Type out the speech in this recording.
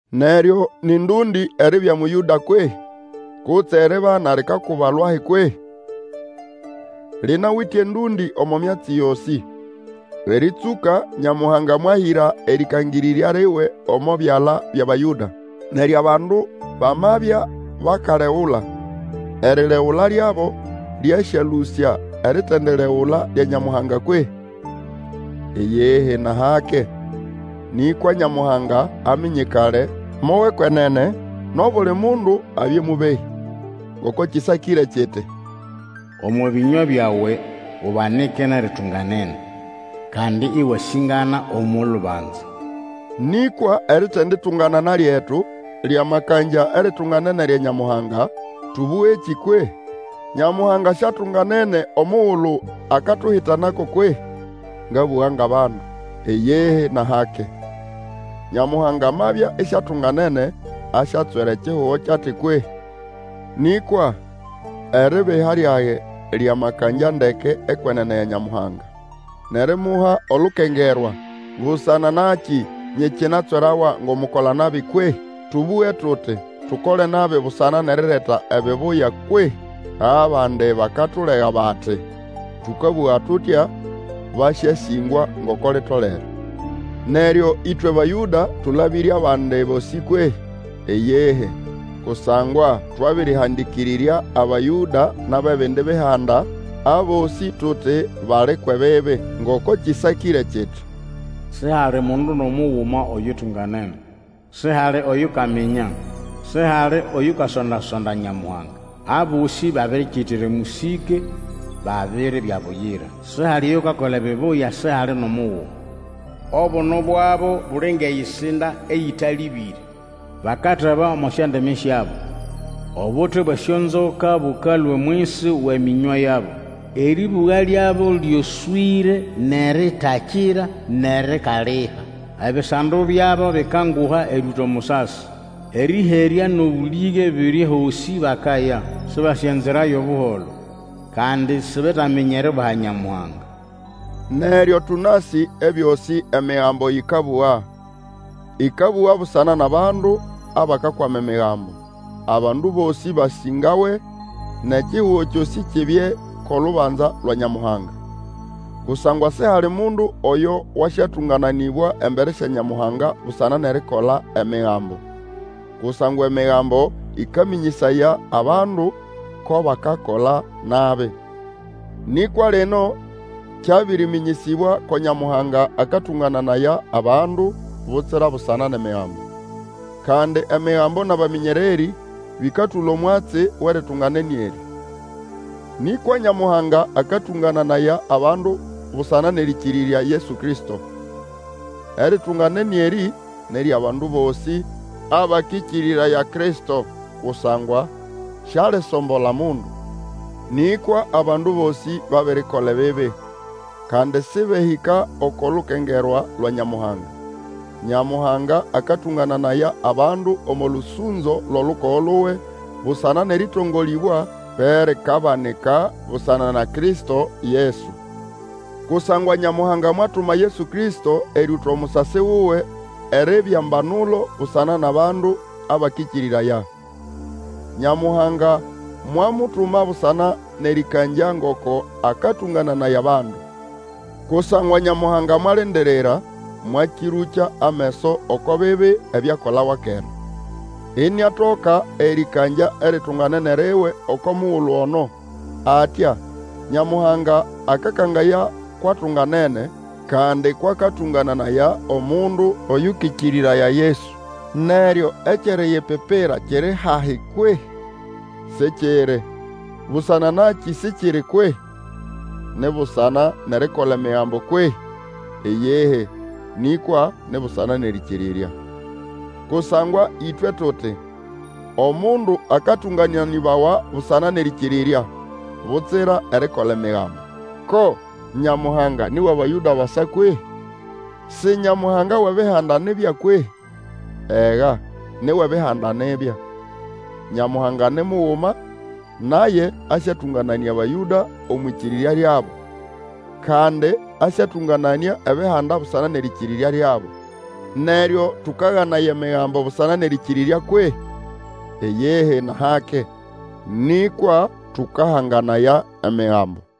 Neryo nĩ ndũndĩ eribya Mũyũda kwehĩ? Kutse eribana likakuba lwahi kwehĩ? Linawite endũndĩ omo myatsi yosĩ. Erĩtsũka Nyamuhanga mwahĩra erĩkangĩrĩrya liwe omo byala byʼAbayũda. Neryo abandu bamabya bakalegula, eriregula lyabo lyasyalũsya eritendiregula lya Nyamuhanga kwehĩ? Iyihi nʼahake. Nĩkwa Nyamuhanga aminyikale mo wʼekwenene, nʼobuli mundu abye mũbehĩ. Ngoko kĩsakĩre kiti, Omo bĩnywa byawe ubanike nʼeritunganene, Kandi ĩwasĩngana omo lubanza. Nĩkwa eritenditunganana lyetu lyamakangya eritunganene lya Nyamuhanga, tũbũgekĩ kwehĩ? Nyamuhanga siatunganene omugulu akatuhitanako kwehĩ? (ngabũga ngʼabandu). Iyihi, nʼahake. Nyamuhanga amabya isiatunganene, asyatswera ekihugo kyʼati kwehĩ? Nĩkwa eribiha lyage lyamakangya ndeke ekwenene ya Nyamuhanga, nʼerimuha olukengerwa, busana nakĩ nyikinatswerawa ngʼomukola-nabi kwehĩ? Tũbũge tuti, Tukole nabi busana nʼerireta ebibuya kwehĩ? Abandi bakatulega bati, tũkabũga tutya. Basyasĩngwa ngoko litolere. Neryo ĩtwe Abayũda tũlabĩre abandi bosĩ kwehĩ? Iyihi, kusangwa twabĩrĩhandĩkĩrĩrya Abayũda nʼabʼebindi Bihanda, abosĩ tuti bali kwʼebibi. Ngoko kĩsakĩre kiti, Sihali mundu nʼomuguma oyutunganene; Sihali oyukaminya, Sihali oyukasonda-sonda Nyamuhanga; Abosĩ babirikitira emũsĩke, babiribya buyira, Sihali oyukakola ebibuya, sihali nʼomuguma; Obuno bwabo buli ngʼeyisinda eyĩtalĩbĩre; Bakateba omo syondimi syabo. Obuti bwʼesyonzoka bũkalũa omwisi wʼemĩnywa yabo. Erĩbũga lyabo Ĩyoswĩre nʼeritakira nʼerikaliha. Ebisando byabo bikanguha erĩũta omusasi. Erĩherya nʼobũlĩge biri ehosĩ bakaya. Sĩbasĩ enzira yʼobuholo. Kandi sibetaminya eriubaha Nyamuhanga. Neryo tũnasĩ ebyosĩ Emigambo yĩkabũga, ĩkabũga busana nʼabandu abakakwama Emigambo, abandu bosĩ basĩngawe, nʼekihugo kyosĩ kibye kʼolubanza lwa Nyamuhanga. Kusangwa sihali mundu oyo wasyatũngananĩbwa embere sya Nyamuhanga busana nʼerikola Emigambo. Kusangwa Emigambo ĩkamĩnyĩsaya abandu ko bakakola nabi. Nĩkwa lino kyabĩrĩmĩnyĩsĩbwa ko Nyamuhanga akatũngananaya abandu butsira busana nʼEmigambo. Kandi Emigambo nʼabamĩnyererĩ bĩkatũla omwatsi wʼeritunganene erĩ. Nĩkwa Nyamuhanga akatũngananaya abandu busana nʼerĩkĩrĩrya Yesu Kristo. Eritunganene erĩ ni ryʼabandu bosĩ abakĩkĩrĩraya Kristo, kusangwa sialisombola mundu. Nĩkwa abandu bosĩ babirikola ebibi, kandi sĩbehĩka oko lukengerwa lwa Nyamuhanga. Nyamuhanga akatũngananaya abandu omo lũsũnzo lwʼolukogo luwe busana nʼerĩtongolĩbwa, erikabanika busana na Kristo Yesu. Kusangwa Nyamuhanga mwatuma Yesu Kristo erĩũta omusasi wuwe eribya mbanulo busana nʼabandu abakĩkĩrĩraya. Nyamuhanga mwamutuma busana nʼerĩkangya ngoko akatũngananaya abandu. Kusangwa Nyamuhanga mwalindirira, mwakĩrũkya ameso oko bibi ebyakolawa kera; iniatoka erĩkangya eritunganene riwe oko mugulu ono. Atya, Nyamuhanga akakangaya kwʼatunganene, kandi kwʼakatũngananaya omundu Oyũkĩkĩrĩraya Yesu. Neryo ekyʼeriyipipira kiri hahi kwehĩ? Sikiri. Busana nakĩ sikiri kwehĩ? Ni busana nʼerikola Emigambo kwehĩ? Iyihi, nĩkwa ni busana nʼerĩkĩrĩrya. Kusangwa ĩtwe tuti, omundu akatũngananĩbawa busana nʼerĩkĩrĩrya, butsira erikola Emigambo. Ko Nyamuhanga ni wʼAbayũda basa kwehĩ? Si Nyamuhanga wʼEbihanda nibya kwehĩ? Ega, ni wʼEbihanda nibya. Nyamuhanga ni muguma, naye asyatũngananĩa Abayũda omwʼĩkĩrĩrya lyabo, kandi asyatũngananĩa Ebihanda busana nʼerĩkĩrĩrya lyabo. Neryo tũkaganaya Emigambo busana nʼerĩkĩrĩrya kwehĩ? Iyihi, nʼahake. Nĩkwa tũkahanganaya Emigambo.